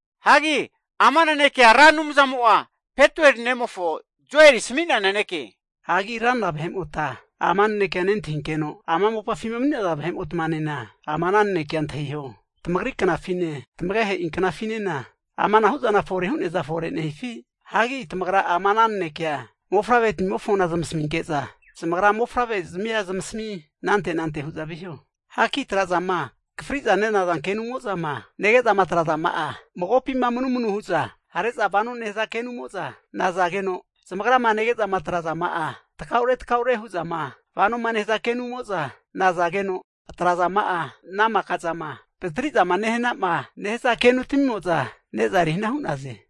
Hagi ama nanekea Ra Anumzamo'a Petueli ne'mofo Joeli asami'nea naneke. Hagi ranra vahe'mota ama nanekea nentahinkeno, ama mopafima mani'naza vahe'motmanena ama ana nanekea antahiho. Tamagri knafine tamagehe'i knafinena, amanahu zana fore hu'neaza fore nehifi? Hagi tamagra ama ana nanekea mofavre'tamimofo zamasaminke'za, zamagra mofavre'zmia zamasami anante anante hu'za viho. Hagi tra'zama akafri'za nenaza kenumo'zama nege'zama atrazama'a, magopima manumanu hu'za hare'za vanoma nehaza kenumo'za nazageno, zamagrama nege'za atrazama'a takaure takaure'ma hu'zama vano nehaza kenumo'za nazageno, atrazama'a ana maka zama vatri'zama nehana'ma nehaza kenutmimo'za ne'za erihana hu'naze.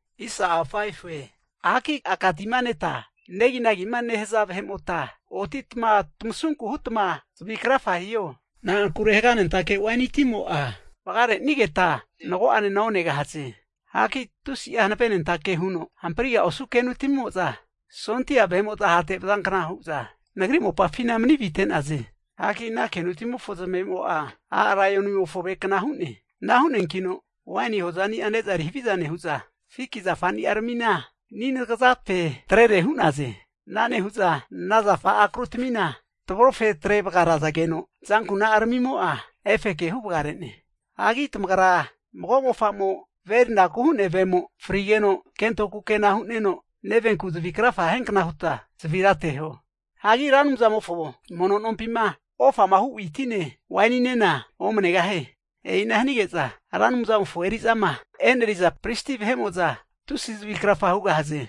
Hagi aka tima neta neginagima nehaza vahe'mota otitma tamasunku hutma zavi krafa hiho. Na'ankure haganentake waini timo'a vagarenigeta mago'anena onegahaze. Hagi tusi'a hanavenentake huno hampriga osu kenutmimo'za, sondia vahe'mo'za hate vazankna hu'za nagri mopafina mani vite'naze. Hagi ana kenutamimofona zamavemo'a a' laionimofo avekna hu'ne. Ana hu'neankino waini hozani'a ne'za eri haviza nehu'za, fiki zafani'aramina ani anagazape atrere hu'naze. Ana nehu'za ana zafa akrutamina tavrofetre vagarazageno azankuna'aramimo'a efeke huvagare'ne. Hagi tamagra mago mofa'mo ve erinaku hu'nea vemo frigeno, kento kukena hu'neno, nevenku zavi krafa hiankna huta zavira ateho. Hagi Ra Anumzamofo mono nompima ofama hu witine waininena omanegahie. E'ina hanige'za Ra Anumzamofo eri'zama eneriza pristi vahe'mo'za tusi zavi krafa hugahaze.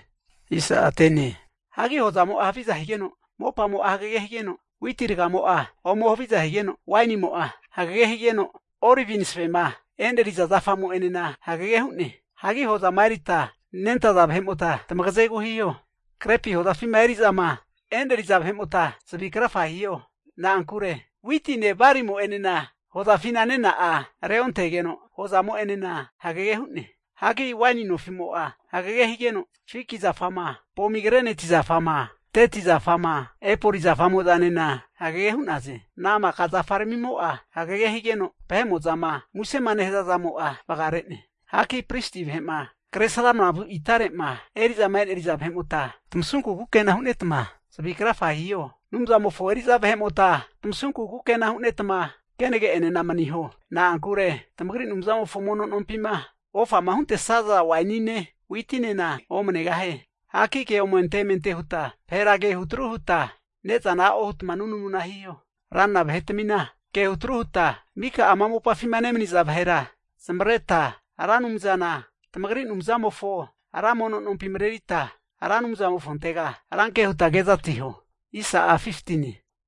Hagi hozamo'a haviza higeno, mopamo'a hagege higeno, witi ragamo'a ome haviza higeno, wainimo'a hagege higeno, olivi masavema eneriza zafamo'enena hagege hu'ne. Hagi hozama erita nentaza vahe'mota tamagazegu hiho. Grepi hozafima eri'zama eneriza vahe'mota zavi krafa hiho. Na'ankure witine balimo'enena hozafina nena'a reontegeno hozamo'enena hagege hu'ne. Hagi waini nofimo'a hagege higeno, fiki zafama, pomigreneti zafama, deti zafama, epoli zafamo'zanena hagege hu'naze. Ana maka zafaramimo'a hagege higeno, vahe'mo'zama musema nehaza zamo'a vagare'ne. Hagi pristi vahe'ma kre sramana vu itare'ma eri'zama eneriza vahe'mota tamasunku kukena hunetma zavi krafagea hiho. Anumzamofo eri'za vahe'mota tamasunku kukena hunetma kenage'enena maniho. Na'ankure tamagri Anumzamofo mono nompima ofama huntesaza wainine witinena omanegahie. Hagi ke omente emente huta vahera ke hutru huta ne'zana a'o hutma nunamu hiho. Ranra vahetamina ke hutru huta, mika ama mopafima nemaniza vahera zamavareta Ra Anumzana tamagri Anumzamofo ra mono nompi marerita, Ra Anumzamofontega rankea huta kezatiho.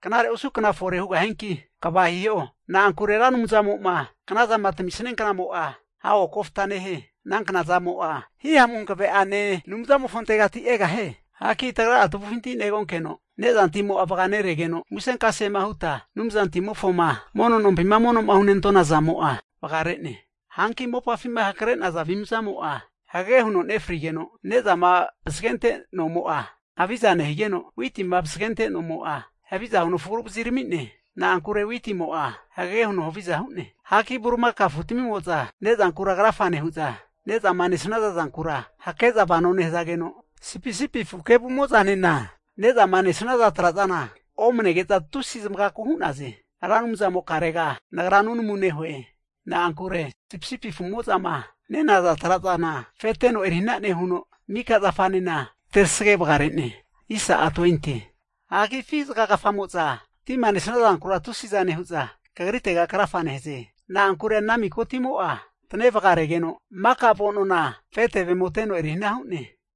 Knare osu kna fore hugahianki, kva hiho! Na'ankure Ra Anumzamo'ma knazama tami'sania knamo'a, hago kofta nehie. Ana knazamo'a Hihamu Hankave'ane Anumzamofontegati egahie. Hagi tagra'a tavufinti negonkeno nezantimo'a vaganeregeno, musenkasema huta Anumzantimofo mono nompima mono'ma hunentona zamo'a vagare'ne. Hanki mopafima hankre'naza avimzamo'a, hagege huno nefrigeno, nezama vasagente nomo'a haviza nehanigeno, witima vasagente nomo'a haviza huno frugu vaziramine. Na'ankure witimo'a hagege huno haviza hu'ne. Hagi bulimakao afutamimo'za ne'zankura krafa nehu'za, ne'zama nesaza zankura hake'za vano nehazageno, sipisipi afu kevumo'zanena ne'zama nesnaza tra'zana omanege'za tusi zamagaku hu'naze. Ra Anumzamokarega nagra nunamuna nehue. Na'ankure sipisipi afu'mo'zama nenaza trazana afeteno erihana nehuno, mika zafanena terasage vagare'ne. Hagi afi zagagafa'moza tima nesaza zankura tusiza nehu'za Kagritega krafa nehaze. Na'ankure ana miko timo'a tane vagaregeno, maka avo'nona afe tevemo teno erihana hu'ne.